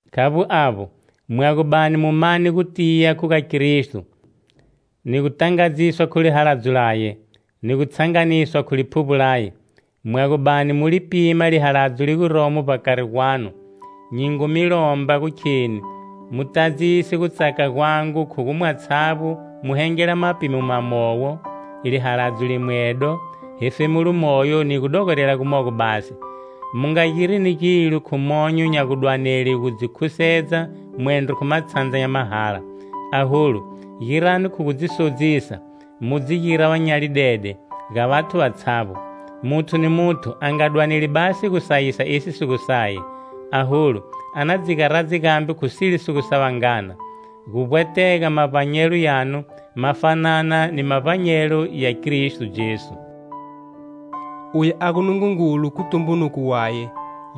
Khavbo avbo, mwa gu bani mu mane gutiya khu ga Kristo, ni gutangadziswa khu lihaladzo laye, ni gu tshanganiswa khu Liphuvbo laye, mwa gu bani mu li pima lihaladzo li guromo vbakari gwanu, nyi ngu mi lomba gu kheni mu tadzise gutsaka gwangu khu gu, mwatshavbo mu hengele mapimo mawowo, lihaladzo limwedo, hefemulo moyo ni gudogorela gumogo basi. Mu nga girini gilo khu monyo nya gudwanele gu dzi khusedza mwendro khu matshandza nya mahala, aholu, girani khu gu dzi sodzisa, mu dzi gira va nyalidede ga vathu vatshavbo. Muthu ni muthu a nga dwaneli basi gusayisa esi si gu saye, aholu, a na dzi garadze gambe khu sile si gu sa vangana. Gu vbwetega mavbanyelo yanu ma fanana ni mavbanyelo ya Kristo Jesu. Uye a gu Nungungulu khu tumbunuko waye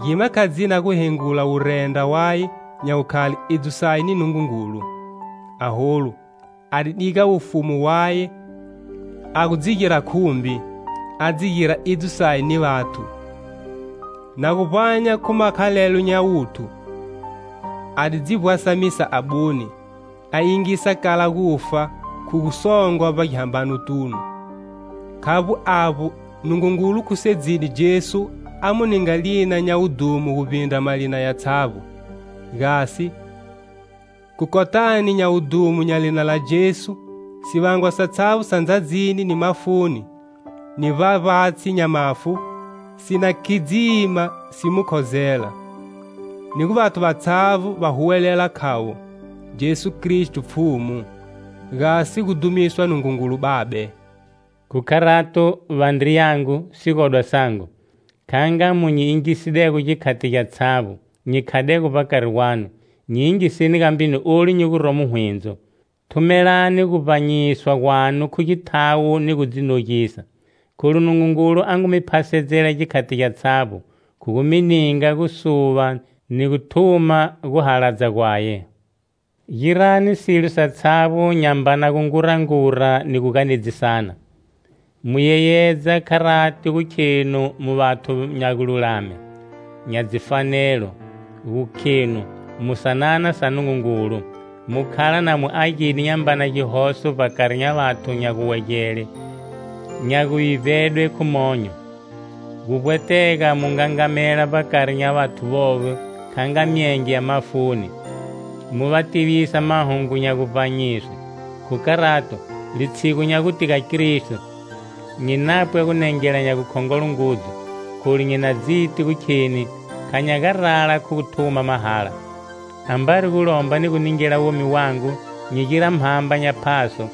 gima kha dzina guhengula wurendra waye nya gukhale idzo saye ni Nungungulu. Aholu a di diga wufumu waye a gu dzi gira khumbi,a dzi gira idzo saye ni vathu.Na gu vbanya khu makhalelo nya wuthu, a di dzi vbwasamisa abune,a yingisa kala gufa khu gu songwa vbagihambanotunu. Khavbo avbo, Nungungulu khusedzide Jesu a mu ninga lina nya wudhumo guvbindra malina yatshavbo; gasi, khu kotani nya wudhumo nya lina la Jesu,sivangwa satshavbo sa ndzadzini,ni mafuni ni vbavbatshi nya mafu,si na khidzima si mu khozela; ni gu vathu vatshavbo va huwelela,khavo: "Jesu Kristo Pfhumu", gasi gu dhumiswa Nungungulu Babe. Khu kharato, vandriyangu, sigodwa sangu, kha nga mu nyi yingisidego gikhati gyatshavbo nyi khadego vbakari gwanu, nyi yingiseni gambe ni olu nyi guromo hwindzo. Thumelani guvbanyiswa gwanu khu githawo ni gu dzi nogisa, kholu Nungungulu a ngu mi phasedzela gikhati gyatshavbo khu gu mi ninga gusuva ni guthuma guhaladza gwaye. Girani silo satshavbo nyambana gungurangura ni gu ganedzisana, mu yeyedza kharati gu khenu mu vathu nya gululame, nya dzifanelo, gu khenu mu sanana sa Nungungulu, mu khala na mu agide nyambana gihoso vbakari nya vathu nya guwegele nya gu vivbedwa khu monyo. Guvbwetega mu ngangamela vbakari nya vathu vovo kha nga myenge ya mafuni, mu va tivisa mahungu nya guvbanyise. Khu kharato, litshigu nya gute ga Kristo, nyi napwa gunengela nya gukhongolo ngudzu, kholu nyi na dziti gu kheni kha nya garala khu guthuma mahala. Ambari gu lomba gu ningela womi wangu nyi gira mhamba nya phaso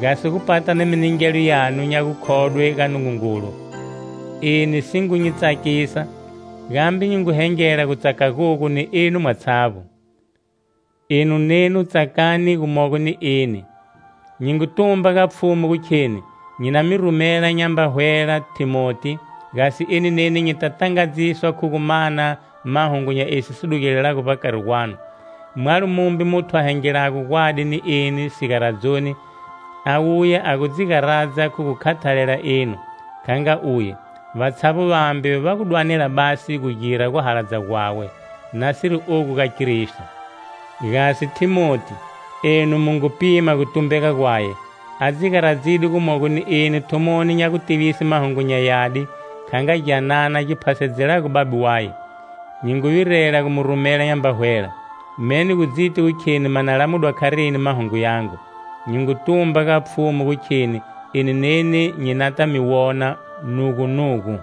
gasi gu pata ni miningelo yanu nya gukhodwe ga Nungungulu. Eni si ngu nyi tsakisa, gambe nyi ngu hengela gutsaka gogu ni enu mwatshavbo. Enu nenu tsakani gumogo ni eni. Nyi ngu tumba ga Pfhumu gu kheni nyi na mi rumela nyamba hwela Thimoti, gasi eni neni nyita tangadziswa khu gu mana mahungu nya esi si dugelelago vbakari gwanu. Mwalo mumbe muthu a hengelago gwadi ni eni sigaradzoni, a wuya a gu dzi garadza khu gu khathalela enu, kha nga uye. Vatshavbo vambe va gu dwanela basi gu gira guhaladza gwawe, nasiri ogu ga Kristo. Gasi Thimoti, enu mu ngu pima gutumbega gwaye: a dzi garadzide gumogo ni eni thumoni nya gutivise Mahungu nya Yadi, kha nga gyanana gi phasedzelago babe waye. Nyi ngu virela gu mu rumela nyamba hwela, me ni gu dziti gu kheni ma na lamudwa kharini mahungu yangu. Nyi ngu tumba ga Pfhumu gu kheni eni neni nyi nata mi wona nugunugu.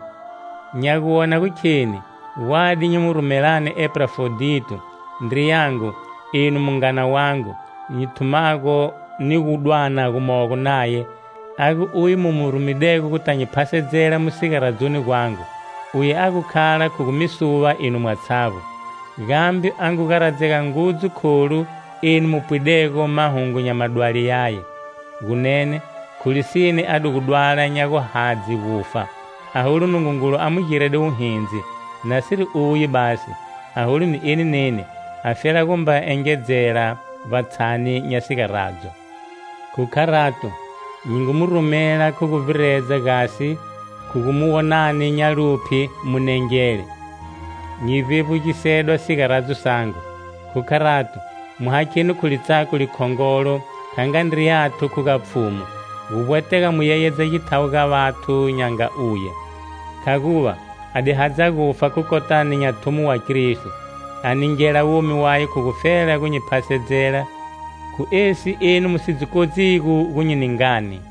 Nya gu wona gu kheni gwadi nyi mi rumelani Epafrodito, ndriyangu eno mungana wangu nyi thumago ni gu dwana gomogo naye, a gu uye mu mu rumedego guta nyi phasedzela mu sigaradzoni gwangu. Uye a gu khala khu gu mi suva enu mwatshavbo, gambe a ngu garadzega ngudzu kholu enu mu pwidego mahungu nya madwali yaye. Gunene, khu lisine a di gu dwala nya guhadze gufa, aholu Nungungulu a mu girede wuhindzi, nasiri uye basi, aholu ni eni neni, a fela gumba engedzela vbatshani nya sigaradzo. Khu kharato, nyi ngu mu rumela khu guvbiredza gasi, khu gu mu wonani nya luphye, mu nengele, nyi vbevbugisedwa sigaradzo sangu. Khu kharato, mu hakheni khu litsako likhongolo kha nga ndriyanu khu ga Pfhumu. Guvbwetega mu yeyedza githawo ga vathu nya nga uye, khaguva a di hadza gufa khu kotani nya thumo wa Kristo, a ningela womi waye khu gufela gu nyi phasedzela khu esi enu mu si dzi kodzigo gu nyi ningani.